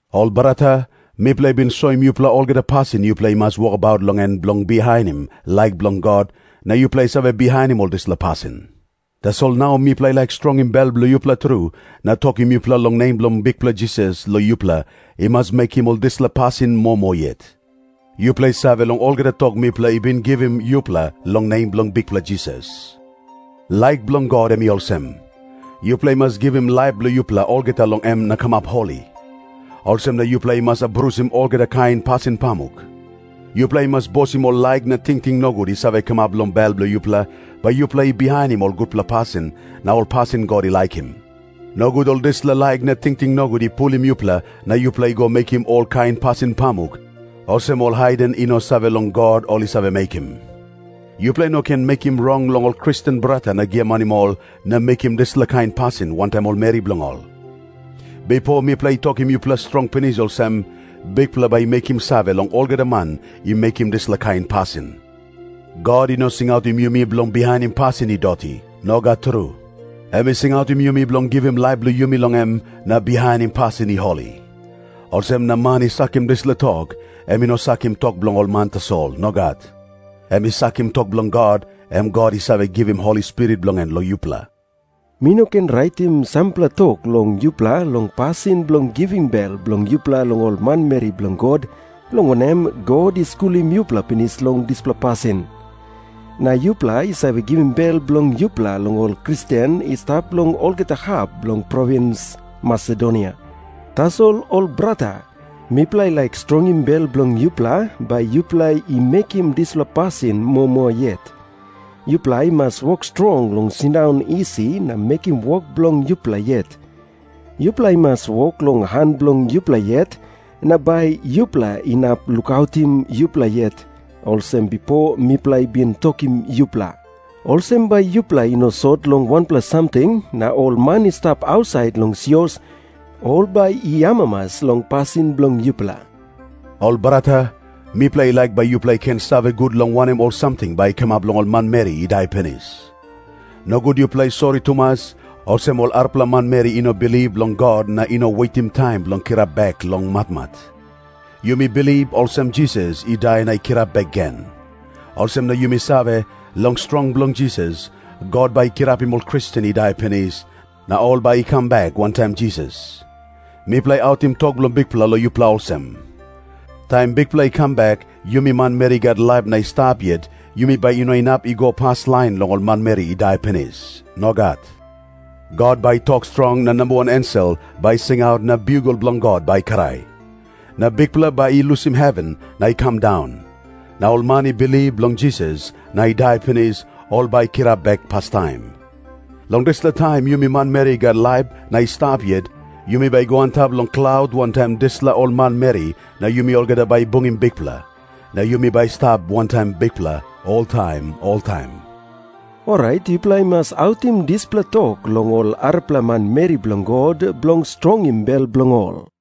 Ol brata, mipela i bin soim yupela olgeta pasin yupela i mas wokabaut long en bilong bihainim laik bilong God, na yupela i save bihainim ol dispela pasin. Tasol nau mipela i laik strongim bel bilong yupela tru na tokim yupela long nem bilong Bikpela Jisas long yupela i mas mekim ol dispela pasin moa moa yet. Yupela i save long olgeta tok mipela i bin givim yupela long nem bilong Bikpela Jisas. Laik bilong God em i olsem. Yupela i mas givim laip bilong yupela olgeta long em na kamap holi. Olsem na yupela i mas abrusim olgeta kain pasin pamuk. Yupela i mas bosim ol laik na tingting nogut i save kamap long bel bilong yupela, bai yupela i bihainim ol gutpela pasin na ol pasin God i laikim. Nogut ol dispela laik na tingting nogut i pulim yupela na yupela i go mekim olkain pasin pamuk olsem ol haiden i no save long God ol i save mekim. Yupela i no ken mekim rong long ol Kristen brata na giamanim ol na mekim dispela kain pasin wantaim ol meri bilong ol. Bipo mipela i tokim yupela strong pinis olsem, Bikpela bai i mekim save long olgeta man i mekim dispela kain pasin. God i no singautim yumi bilong bihainim pasin i doti. Nogat tru. Em i singautim yumi bilong givim laip bilong yumi long em na bihainim pasin i holi. Olsem na man i sakim dispela tok, em i no sakim tok bilong ol man tasol. Nogat. Em i sakim tok bilong God, em God i save givim Holi Spirit bilong en long yupela. Mi no ken raitim sampela tok long yupela long pasin bilong givim bel bilong yupela long ol manmeri bilong God, long wanem, God i skulim yupela pinis long dispela pasin. Na yupela i save givim bel bilong yupela long ol Kristen i stap long olgeta hap bilong provins Masedonia. Tasol, ol brata, mipela i laik strongim bel bilong yupela, bai yupela i mekim dispela pasin moa moa yet. Yupela i mas wok strong long sindaun isi na mekim wok bilong yupela yet. Yupela i mas wok long han bilong yupela yet, na bai yupela inap lukautim yupela yet, olsem bipo mipela i bin tokim yupela. Olsem bai yupela i no sot long wanpela samting, na ol man i stap ausait long sios, ol bai i amamas long pasin bilong yupela. Ol brata, mipela i laik bai yupela i ken save gut long wanem ol samting bai i kamap long ol manmeri i dai pinis. Nogut yupela i sori tumas, olsem ol arapela manmeri i no bilip long God na i no wetim taim bilong kirap bek long matmat. Yumi bilip olsem Jisas i dai na i kirap bek gen. Olsem na yumi save, long strong bilong Jisas, God bai i kirapim ol Kristen i dai pinis na ol bai i kam bek wantaim Jisas. Mipela i autim tok bilong Bikpela long yupela olsem. Taim Bikpela i kam bek, yumi manmeri i gat laip na i stap yet, yumi bai i no inap i go paslain long ol manmeri i dai pinis. Nogat. God bai i tok strong, na namba wan ensel bai i singaut, na biugel bilong God bai i krai. Na Bikpela bai i lusim heven na i kam daun. Na ol man i bilip long Jisas na i dai pinis, ol bai i kirap bek pastaim. Long dispela taim yumi manmeri i gat laip na i stap yet, yumi bai i go antap long klaut wantaim ol dispela manmeri, na yumi olgeta bai i bungim Bikpela. Na yumi bai i stap wantaim Bikpela oltaim oltaim. Orait yupela i mas autim dispela tok long ol arapela manmeri bilong God, bilong strongim bel bilong ol.